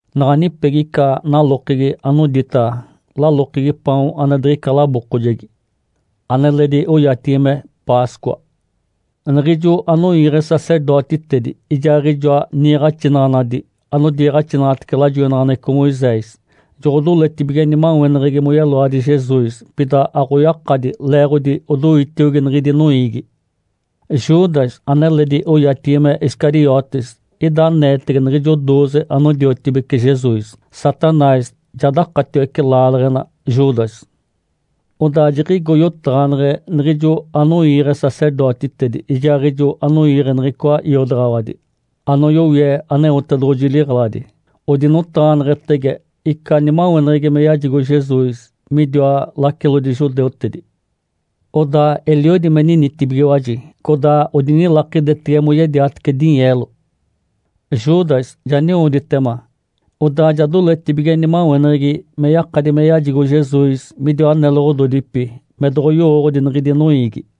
Naɡ̶a nipegi ica nalokegi anodita “Lalokegi paon ane diɡ̶ica labookojegi”, aneledi oyatigi me “Páscoa”. Niɡ̶ijo anoiiɡ̶e sacerdotitedi ijaaɡ̶ijoa niiɡ̶axinaɡ̶anadi anodiiɡ̶axinaɡ̶atece lajoinaɡ̶aneɡ̶eco Moisés, joɡ̶odoletibige nimaweneɡ̶egi moyeloadi Jesus. Pida aɡ̶oyakadi, leeɡ̶odi odoitiogi niɡ̶idi noiigi. Judas, aneledi oyatigi me Iscariotes, ida aneetege niɡ̶ijo dooze anodiotibece Jesus. Satanás ja dakatiwece laaleɡ̶ena Judas. Odaa jiɡ̶igo yotaɡ̶aneɡ̶e niɡ̶ijo anoiiɡ̶e sacerdotitedi ijaaɡ̶ijo anoiiɡ̶e niɡ̶icoa iodaɡ̶awadi anoyowie Aneotedoɡ̶oji liɡ̶eladi. Odinotaɡ̶aneɡ̶etege ica nimaweneɡ̶egi me yajigo Jesus midiwa lacilodi judeutedi. Odaa eliodi me ninitibigiwaji, codaa odinilakidetege moyediatece dinyeelo. Judas ja niwoditema, odaa ja doletibige nimaweneɡ̶egi me yakadi me yajigo Jesus midiwa neloɡ̶ododipi me doɡ̶oyowooɡ̶odi niɡ̶idi noiigi.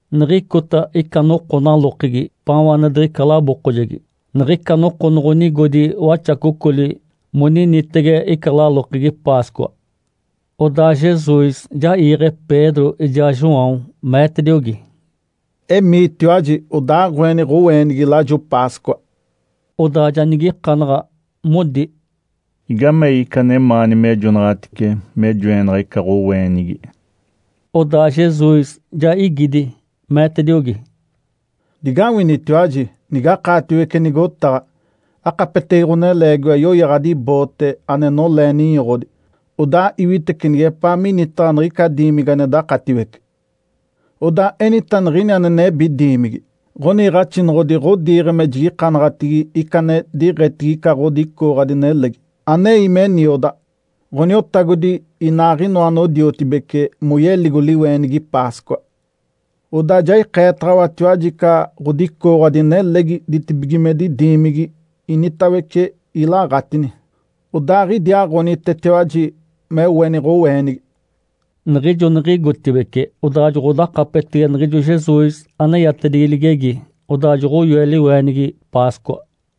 Niɡ̶icota ica noko nalokegi “Paon ane diɡ̶ica labookojegi”, niɡ̶ica noko noɡ̶onigodi waxacocoli moninitege ica lalokegi Páscoa. Odaa Jesus ja iiɡ̶e Pedro ijaa João, meetediogi, “Emiitiwaji odaaɡ̶oeni ɡ̶oweenigi lajo Páscoa.” Odaa ja nigikanaɡ̶a, modi, “Igamei ica anemaani mejonaɡ̶atice me joenaɡ̶a ica ɡ̶oweenigi?” Odaa Jesus ja igidi, meetediogi, “Digawinitiwaji, nigakaatiwece nigotaɡ̶a, akapetege ɡ̶oneleegiwa yoyaɡ̶adi boote ane nolee ninyoɡ̶odi. Odaa iwitece nigepaa minitaɡ̶a niɡ̶ica diimigi ane dakatiwece. Odaa enita niɡ̶ini ane nebi diimigi, ‘Ǥoniiɡ̶axinoɡ̶odi ɡ̶odiiɡ̶e me jigikanaɡ̶atigi ica ane diiɡ̶etigi ica ɡ̶odicooɡ̶adi nelegi, anei me niodaɡ̶a, Ǥoniotagodi inaaɡ̶inoa anodiotibece moyeligo liweenigi Páscoa.’ Odaa ja ikeetaɡ̶awatiwaji ica ɡ̶odicooɡ̶adi nelegi ditibigimedi diimigi initawece ilaɡ̶atini. Odaaɡ̶idiaaɡ̶onitetiwaji me oeni ɡ̶oweenigi.” Niɡ̶ijo niɡ̶igotibeci, odaa joɡ̶odakapetege niɡ̶ijo Jesus aneyatedigi ligegi. Odaa joɡ̶oyoe liweenigi Páscoa.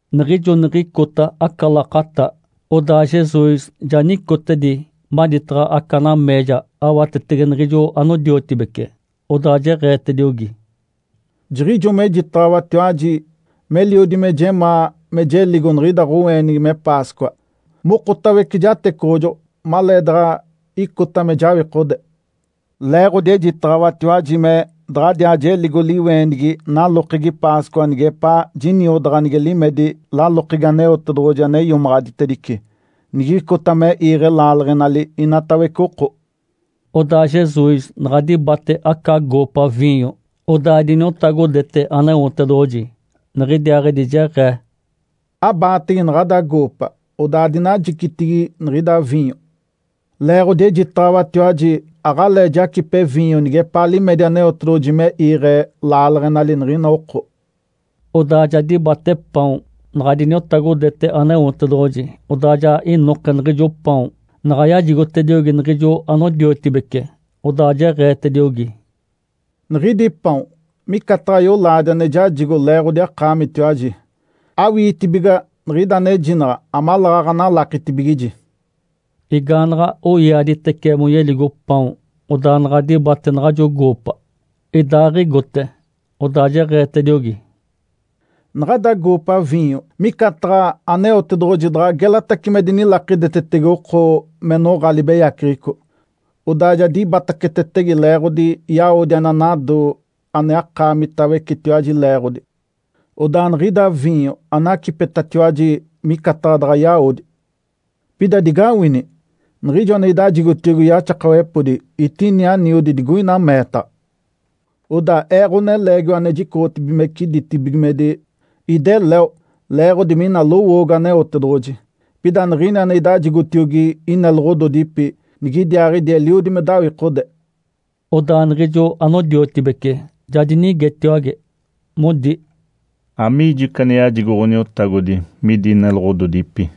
Niɡ̶ijo niɡ̶icota aca lakata, odaa Jesus ja nicotedi maditaɡ̶a aca nameeja awatetege niɡ̶ijo anodiotibece. Odaa jeɡ̶eetediogi, “Jiɡ̶ijo mejitaɡ̶awatiwaji, meliodi me jemaa me jeligo niɡ̶ida ɡ̶oweenigi me Páscoa, mokotawece jatecoɡ̶ojoɡ̶o maleedaɡ̶a icota me jawikode. Leeɡ̶odi ejitaɡ̶awatiwaji me daɡ̶adiaa jeligo liweenigi nalokegi Páscoa nigepaa jiniodaɡ̶a nige limedi lalokegi Aneotedoɡ̶oji ane iomaɡ̶aditedice, nigicota me iiɡ̶e laaleɡ̶enali inatawece oko.” Odaa Jesus naɡ̶a dibate aca goopa viinyo, odaa diniotagodete Aneotedoɡ̶oji. Niɡ̶idiaaɡ̶idi jeɡ̶ee, “Abaatege naɡ̶ada goopa, odaa adinajicitigi niɡ̶ida viinyo. Leeɡ̶odi ejitaɡ̶awatiwaji aɡ̶alee jacipe viinyo nigepaa limedi Aneotedoɡ̶oji me iiɡ̶e laaleɡ̶enali niɡ̶ina oko.” Odaa ja dibate paon, naɡ̶a diniotagodete Aneotedoɡ̶oji. Odaa ja inoke niɡ̶ijo paon. Naɡ̶a yajigotediogi niɡ̶ijo anodiotibece, odaa jeɡ̶eetediogi, “Niɡ̶idi paon micataɡ̶a yolaadi ane jajigo leeɡ̶odi akaamitiwaji. Awiitibiga niɡ̶ida anejinaɡ̶a amaleeɡ̶aɡ̶a analakitibigiji.” Igaanaɡ̶a oiaaditece moyeligo paon, odaa naɡ̶a dibate naɡ̶ajo goopa, idaaɡ̶igote, odaa jeɡ̶eetediogi, “Naɡ̶ada goopa viinyo micataɡ̶a Aneotedoɡ̶oji daɡ̶a gelatace me dinilakidetetege oko me noɡ̶a libeyaceɡ̶eco, odaa ja dibatacetetege leeɡ̶odi yawodi ane anado ane akaamitawecetiwaji leeɡ̶odi. Odaa niɡ̶ida viinyo anacipetatiwaji micataɡ̶a daɡ̶a yawodi. Pida digawini! Niɡ̶ijo ane idajigotiogi yaxakawepodi, etini aniodi digoina meetaɡ̶a. Odaa Ee, Ǥoneleegiwa ane jicoɡ̶otibigimece ditibigimedi, ideleo, leeɡ̶odi mina lowoogo Aneotedoɡ̶oji. Pida niɡ̶ini ane idajigotiogi ineloɡ̶ododipi, nigidiaaɡ̶idi eliodi me dawikode.” Odaa niɡ̶ijo anodiotibece ja dinigetiwage, modi, “Amigijo ica ane yajigo Ǥoniotagodi midi neloɡ̶ododipi?”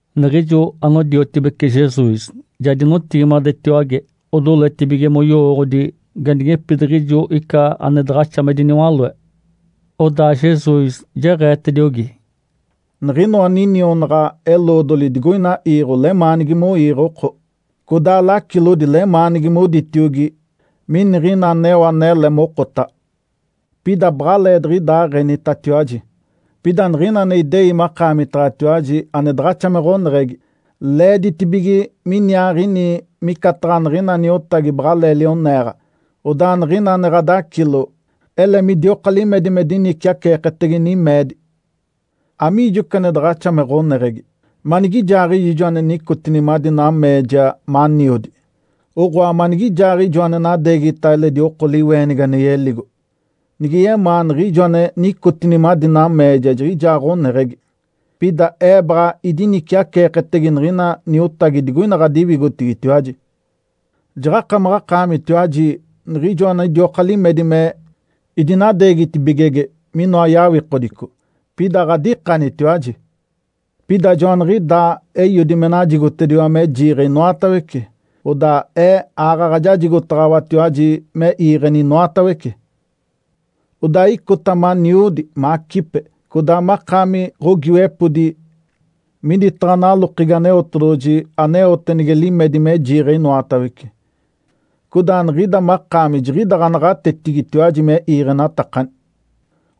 Niɡ̶ijo anodiotibece Jesus ja dinotigimadetiwage, odoletibige moyowooɡ̶odi ganigepidiɡ̶ijo ica ane daɡ̶axa me diniwaloe. Odaa Jesus jeɡ̶eetediogi, “Niɡ̶inoa ninionaɡ̶a-eloodoli digoina iiɡ̶o lemaanigi moiiɡ̶e oko, codaa lacilodi lemaanigi moditiogi, ‘Miniɡ̶ina aneo anele mokotaɡ̶a’. Pida baɡ̶aleediɡ̶idaaɡ̶enitatiwaji. Pida niɡ̶ina ane idei makaamitaɡ̶atiwaji ane daɡ̶axa me ɡ̶oneɡ̶egi, leeditibige miniaaɡ̶ini micataɡ̶a niɡ̶ina niotagi baɡ̶alee lioneeɡ̶a. Odaa niɡ̶ina ane ɡ̶adacilo, ele midioka limedi me diniciaceeketege nimeedi. Amiijo ica ane daɡ̶axa me ɡ̶oneɡ̶egi? Manigijaaɡ̶ijo ijo ane nicotini madi nameeja maniodi, oɡ̶oa, manigijaaɡ̶ijo ane nadeegita eledi oko liweenigi ane yeligo? Nige yemaa niɡ̶ijo ane nicotini madi nameeja jiɡ̶ijaa ɡ̶oneɡ̶egi! Pida Ee baɡ̶a diniciaceeketege niɡ̶ina niotagi digoina ɡ̶adiwigotigitiwaji. Jaɡ̶akamaɡ̶akaamitiwaji niɡ̶ijo anidioka limedi me idinadeegitibigege minoa yawikodico. (Pida aɡ̶adikanitiwaji). Pida joaniɡ̶idaa Eiodi me najigotediwa me jiiɡ̶e inoatawece, odaa Ee, aaɡ̶aɡ̶a jajigotaɡ̶awatiwaji me iiɡ̶eni inoatawece. Odaa icota maniodi, macipe, codaa makaami ɡ̶ogiiwepodi miditaɡ̶a nalokegi Aneotedoɡ̶oji aneote nige limedi me jiiɡ̶e inoatawece. Codaa niɡ̶ida makaami jiɡ̶ida ɡ̶anaɡ̶atetigitiwaji me iiɡ̶enatakani,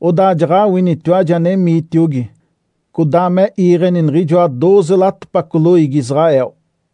odaa jaɡ̶awinitiwaji anemiitiogi, codaa me iiɡ̶eni niɡ̶ijoa dooze latopaco loiigi Israel.”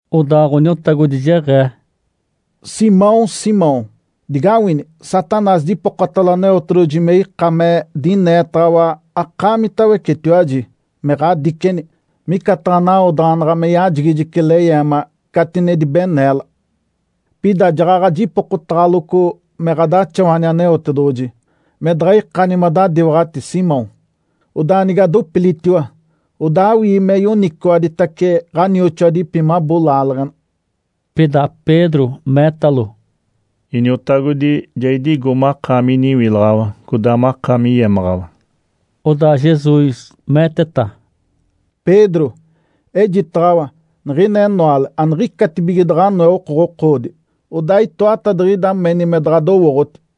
Odaa Ǥoniotagodi jeɡ̶ee, “Simão, Simão, digawini! Satanás dipokotalo Aneotedoɡ̶oji me ika me dineetaɡ̶awa akaamitawecetiwaji, me ɡ̶adigikeni, micataɡ̶a nawodaɡ̶anaɡ̶a me yajigijice leyeema, catinedi beneela. Pida jaɡ̶aɡ̶a jipokotaɡ̶aloco me ɡ̶adaxawani Aneotedoɡ̶oji, me daɡ̶a ikani madadiwaɡ̶ati, Simão. Odaa nige adopilitiwa, odaa awii me yoniciwaditace ɡ̶anioxoadipi mabo laaleɡ̶ena.” Pida Pedro meetalo, “Iniotagodi, ja idigo makaami iniwilaɡ̶awa, codaa makaami yemaɡ̶awa.” Odaa Jesus meeteta, “Pedro, ejitaɡ̶awa, niɡ̶ina enoale aniɡ̶icatibige daɡ̶a anoe okoɡ̶okoodi, odaa itoatadiɡ̶ida meni me daɡ̶adowooɡ̶oti.”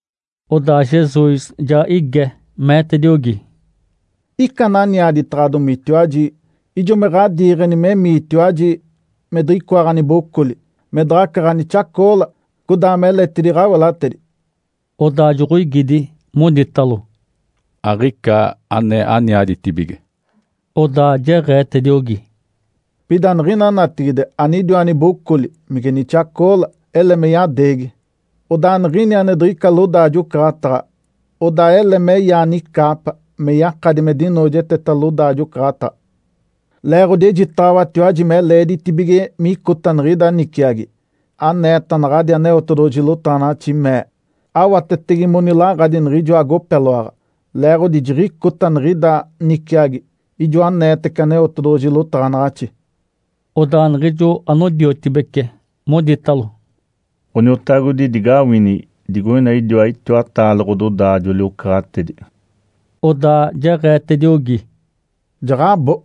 Odaa Jesus ja ige, meetediogi, “Ica ananiaditaɡ̶adomitiwaji, ijo me ɡ̶adiiɡ̶eni memiitiwaji me diɡ̶icoa ɡ̶anibocoli, me daɡ̶aca ɡ̶anixacoola, codaa meletidi ɡ̶awelatedi?” Odaa joɡ̶oigidi, moditalo, “Aɡ̶ica ane aniaditibige.” Odaa jeɡ̶eetediogi, “Pida niɡ̶ina natigide anidiwa nibocoli, mige nixacoola, ele me yadeegi. Odaa niɡ̶ini ane diɡ̶ica lodaajo-ocaɡ̶ataɡ̶a, odaa ele meyaa nicaapa, me yakadi me dinoojeteta lodaajo-ocaɡ̶ataɡ̶a. Leeɡ̶odi ejitaɡ̶awatiwaji me leeditibige micota niɡ̶ida niciagi, aneeta naɡ̶adi Aneotedoɡ̶oji lotaɡ̶anaɡ̶axi mee, ‘Awatetege monilaɡ̶adi niɡ̶ijoa agopeloaɡ̶a.’ Leeɡ̶odi jiɡ̶icota niɡ̶ida niciagi, ijo aneetece Aneotedoɡ̶oji lotaɡ̶anaɡ̶axi.” Odaa niɡ̶ijo anodiotibece moditalo, “Ǥoniotagodi, digawini! Digoina idiwa itiwataale ɡ̶ododaajoli-ocaɡ̶atedi.” Odaa jeɡ̶eetediogi, “Jaɡ̶abo!”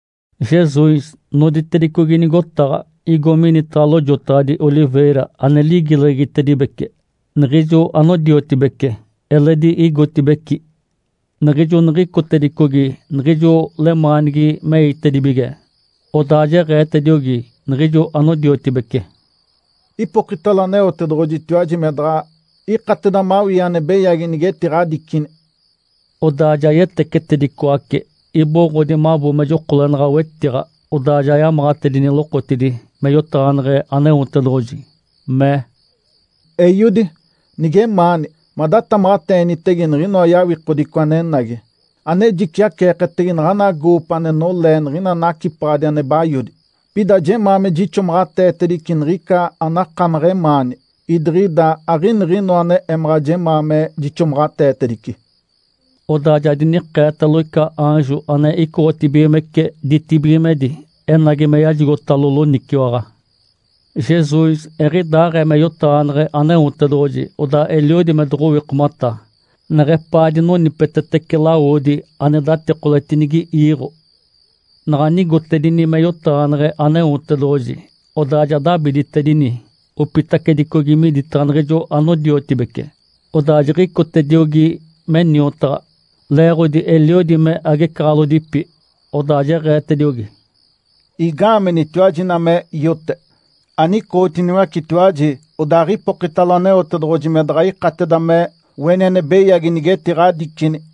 Jesus noditedicogi nigotaɡ̶a, igo minitaɡ̶a Lojotaɡ̶adi Oliveira ane ligileɡ̶egitedibece. Niɡ̶ijo anodiotibece eledi igotibeci. Niɡ̶ijo niɡ̶icotedicogi niɡ̶ijo lemaanigi meitedibige, odaa jeɡ̶eetediogi niɡ̶ijo anodiotibece, “Ipokitalo Aneotedoɡ̶ojitiwaji me daɡ̶a ikateda mawii ane beyagi nigetiɡ̶adicini.” Odaa ja yetecetedicoace, iboɡ̶odi mabo me jokolenaɡ̶a wetiɡ̶a. Odaa ja yamaɡ̶atedini lokotidi me yotaɡ̶aneɡ̶e Aneotedoɡ̶oji, mee, “Eiodi, nigemaani, madatamaɡ̶ateenitege niɡ̶inoa yawikodico anenagi, ane jiciaceeketege naɡ̶ana goopa ane nolee niɡ̶ina nacipaɡ̶adi ane bayodi. Pida jemaa me jixomaɡ̶ateetedice niɡ̶ica anakamaɡ̶a emaani, idiɡ̶ida aɡ̶iniɡ̶inoa ane emaɡ̶a jemaa me jixomaɡ̶ateetedice.” Odaa ja dinikeetalo ica aanjo, ane icoɡ̶otibigimece ditibigimedi, enagi me yajigotalo loniciwaɡ̶a. Jesus eɡ̶idaaɡ̶ee me yotaɡ̶aneɡ̶e Aneotedoɡ̶oji, odaa eliodi me doɡ̶owikomata, neɡ̶epaa dinonipetetece lawodi ane datikoletedinigi iiɡ̶o. Naɡ̶a nigotedini me yotaɡ̶aneɡ̶e Aneotedoɡ̶oji, odaa ja dabiditedini, opitacedicogi miditaɡ̶a niɡ̶ijo anodiotibece, odaa jiɡ̶icotediogi me niotaɡ̶a, leeɡ̶odi eliodi me agecaɡ̶alodipi. Odaa jeɡ̶eetediogi, “Igaamenitiwaji ina me iote? Anicootiniwacetiwaji, odaaɡ̶ipokitalo Aneotedoɡ̶oji me daɡ̶a ikateda me oeni ane beyagi nigetiɡ̶adicini.”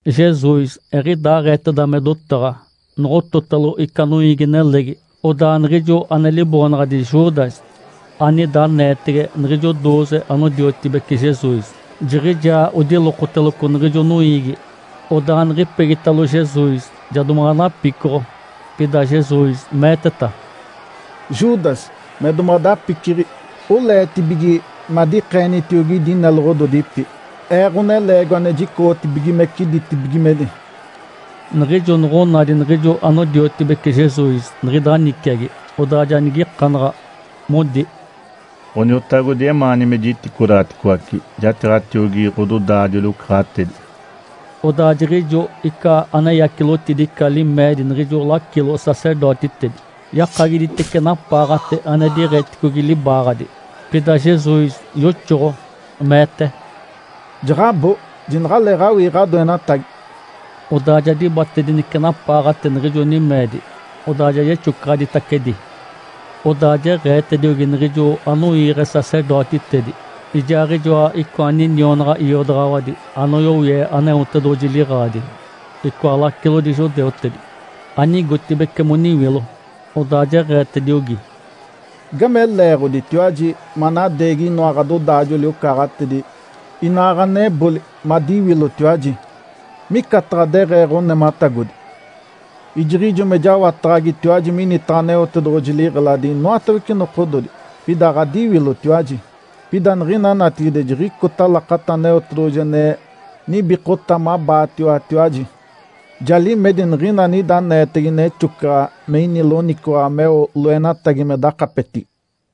Jesus eɡ̶idaaɡ̶eeteda me dotaɡ̶a, noɡ̶ototalo ica noiigi-nelegi. Odaa niɡ̶ijo ane liboonaɡ̶adi Judas, anida aneetege niɡ̶ijo dooze anodiotibece Jesus, jiɡ̶ijaa odilokoteloco niɡ̶ijo noiigi. Odaa niɡ̶ipegitalo Jesus ja domaɡ̶a napicoɡ̶o. Pida Jesus meeteta, “Judas, me domaɡ̶adapiciɡ̶i, oleetibige me adikeenitiogi idi ineloɡ̶ododipi, Ee Ǥoneleegiwa ane jicoɡ̶otibigimece ditibigimedi?” Niɡ̶ijo noɡ̶onadi niɡ̶ijo anodiotibece Jesus niɡ̶ida niciagi, odaa ja nigikanaɡ̶a, modi, “Ǥoniotagodi, emaani me jiticodaɡ̶aticoace jatiiɡ̶atiogi ɡ̶ododaajoli-ocaɡ̶atedi?” Odaa jiɡ̶ijo ica aneyacilotidi ica limeedi niɡ̶ijo lacilo-sacerdotitedi, yakagiditice napaaɡ̶ate ane diɡ̶eticogi libaaɡ̶adi. Pida Jesus yoxoɡ̶o, meete, “Jaɡ̶abo, jinaɡ̶aleeɡ̶awii ɡ̶adoenatagi!” Odaa ja dibatedinece napaaɡ̶ate niɡ̶ijo nimeedi, odaa ja yexocaɡ̶aditacedi. Odaa jeɡ̶eetediogi niɡ̶ijo anoiiɡ̶e sacerdotitedi ijaaɡ̶ijoa icoa ninionaɡ̶a iodaɡ̶awadi anoyowie Aneotedoɡ̶oji liɡ̶eladi, icoa lacilodi judeutedi, anigotibeci moniwilo. Odaa jeɡ̶eetediogi, “Igame leeɡ̶oditiwaji manadeegi inoa ɡ̶adodaajoli-ocaɡ̶atedi inaa ɡ̶aneboli madiwilotiwaji, micataɡ̶a deɡ̶ee ɡ̶onematagodi? Ijiɡ̶ijo me jawataɡ̶agitiwaji minitaɡ̶a Aneotedoɡ̶oji liɡ̶eladi inoatawece nokododi, pida aɡ̶adiwilotiwaji. Pida niɡ̶ina natigide, jiɡ̶icota lakata Aneotedoɡ̶oji ane nibikota mabaatiwatiwaji, ja limedi niɡ̶ina anida aneetege nexocaɡ̶a me ini loniciwaɡ̶a meo loenatagi me dakapetigi.”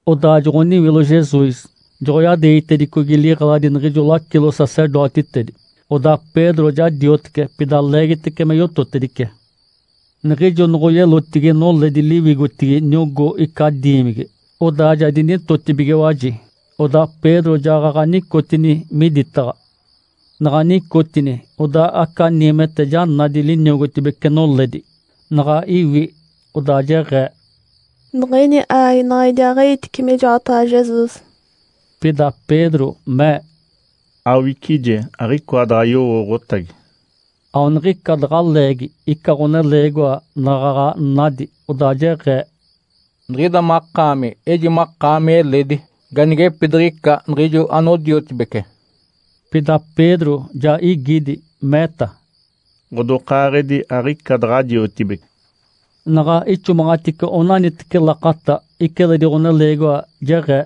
Odaa joɡ̶oniwilo Jesus, joɡ̶oyadeegitedicogi liɡ̶eladi niɡ̶ijo lacilo-sacerdotitedi. Odaa Pedro ja diotece, pida leegitece me yototedice. Niɡ̶ijo noɡ̶oyelotigi noledi liwigotigi niogó ica diimigi, odaa ja dinitotibigiwaji. Odaa Pedro jaɡ̶aɡ̶a nicotini miditaɡ̶a. Naɡ̶a nicotini, odaa aca niimete ja nadi liniogotibece noledi. Naɡ̶a iwi, odaa jeɡ̶ee, “Niɡ̶ini aaginaɡ̶a idiaaɡ̶i-iitice mijoataɡ̶a Jesus!” Pida Pedro mee, “Awicije, aɡ̶icoa daɡ̶a yowooɡ̶otagi!” Aona niɡ̶ica daɡ̶a leegi, ica ɡ̶oneleegiwa naɡ̶aɡ̶a nadi, odaa jeɡ̶ee, “Niɡ̶ida makaami eji makaami eledi ganigepidiɡ̶ica niɡ̶ijo anodiotibece.” Pida Pedro ja igidi, meeta, “Ǥodokaaɡ̶edi, aɡ̶ica daɡ̶a jiotibece!” Naɡ̶a ixomaɡ̶atice onaniteci lakata, ica eledi ɡ̶oneleegiwa jeɡ̶ee,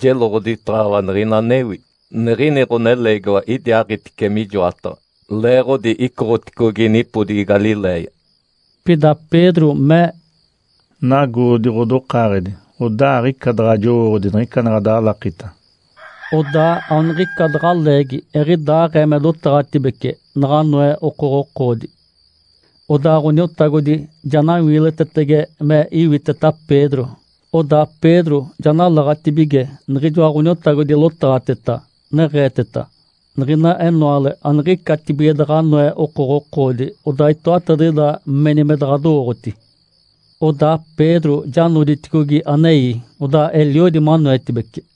“Jeloɡ̶oditaɡ̶awa niɡ̶ina anewi, niɡ̶ini ɡ̶oneleegiwa idiaaɡ̶itice mijoataɡ̶a, leeɡ̶odi icoɡ̶oticogi nipodigi Galiléia!” Pida Pedro mee, “Nagoodi ɡ̶odokaaɡ̶edi, odaa aɡ̶ica daɡ̶a jowooɡ̶odi niɡ̶ica ane ɡ̶adalakita!” Odaa aoniɡ̶ica daɡ̶a leegi, eɡ̶idaaɡ̶ee me dotaɡ̶atibece, naɡ̶anoe okoɡ̶okoodi. Odaa Ǥoniotagodi ja nawiilitetetege me iwiteta Pedro. Odaa Pedro ja nalaɡ̶atibige niɡ̶ijoa Ǥoniotagodi lotaɡ̶ateta, neɡ̶eeteta, “Niɡ̶ina enoale, aniɡ̶icatibige daɡ̶a anoe okoɡ̶okoodi, odaa itoatadiɡ̶ida meni me daɡ̶adowooɡ̶oti.” Odaa Pedro ja noditicogi anei, odaa eliodi manoetibece.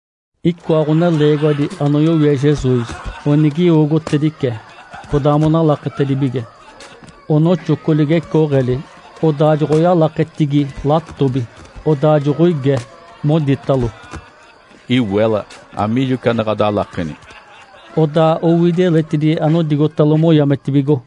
Icoa ɡ̶oneleegiwadi anoyowie Jesus onigiwogotedice, codaa monalaketedibige. Onoxoco ligecooɡ̶eli, odaaɡ̶oyalaketigi latobi, odaa joɡ̶oige, moditalo, “Iwela, amiijo ica ane ɡ̶adalakeni?” Odaa owidi eletidi anodigotalo moyametibigo.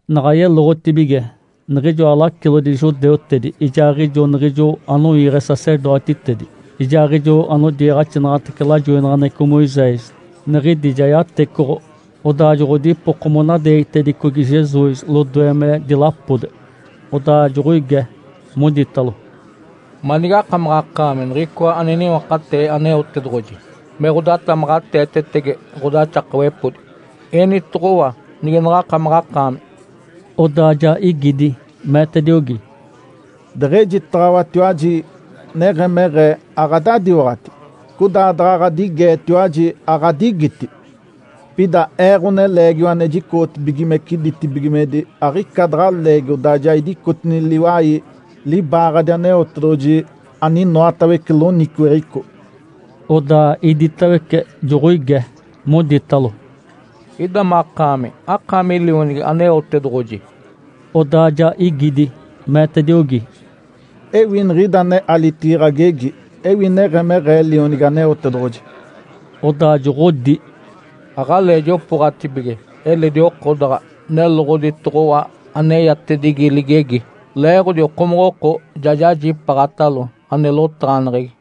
Naɡ̶a yeloɡ̶otibige, niɡ̶ijoa lacilodi judeutedi, ijaaɡ̶ijo niɡ̶ijo anoiiɡ̶e sacerdotitedi, ijaaɡ̶ijo anodiiɡ̶axinaɡ̶atece lajoinaɡ̶aneɡ̶eco Moisés, niɡ̶idi ja yatecoɡ̶o. Odaa joɡ̶odipoko monadeegitedicogi Jesus lodoe me dilapode. Odaa joɡ̶oige, moditalo, “Manige akamaɡ̶akaami Niɡ̶icoa ane niwakatee Aneotedoɡ̶oji me ɡ̶odatamaɡ̶ateetetege ɡ̶odaxakawepodi? Enitoɡ̶owa nige naɡ̶akamaɡ̶akaami!” Odaa ja igidi, meetediogi, “Deɡ̶ejitaɡ̶awatiwaji neɡ̶emeɡ̶ee, aɡ̶adadiwaɡ̶ati. Codaa daɡ̶a ɡ̶adigeetiwaji, aɡ̶adigiti. Pida Ee, Ǥoneleegiwa ane jicoɡ̶otibigimece ditibigimedi, aɡ̶ica daɡ̶a leegi odaa ja idicotini liwai libaaɡ̶adi Aneotedoɡ̶oji aninoatawece loniciweɡ̶eco.” Odaa iditawece joɡ̶oige, moditalo, “Ida makaami, akaami Lionigi Aneotedoɡ̶oji?” Odaa ja igidi, meetediogi, “Ewi niɡ̶ida alitigi ɡ̶agegi ewi neɡ̶emeɡ̶ee Lionigi Aneotedoɡ̶oji.” Odaa joɡ̶odi, “Aɡ̶alee jopooɡ̶atibige eledi oko daɡ̶a neloɡ̶oditoɡ̶owa aneyatedigi ligegi, leeɡ̶odi okomoɡ̶oko ja jajipaaɡ̶atalo ane lotaɡ̶aneɡ̶egi!”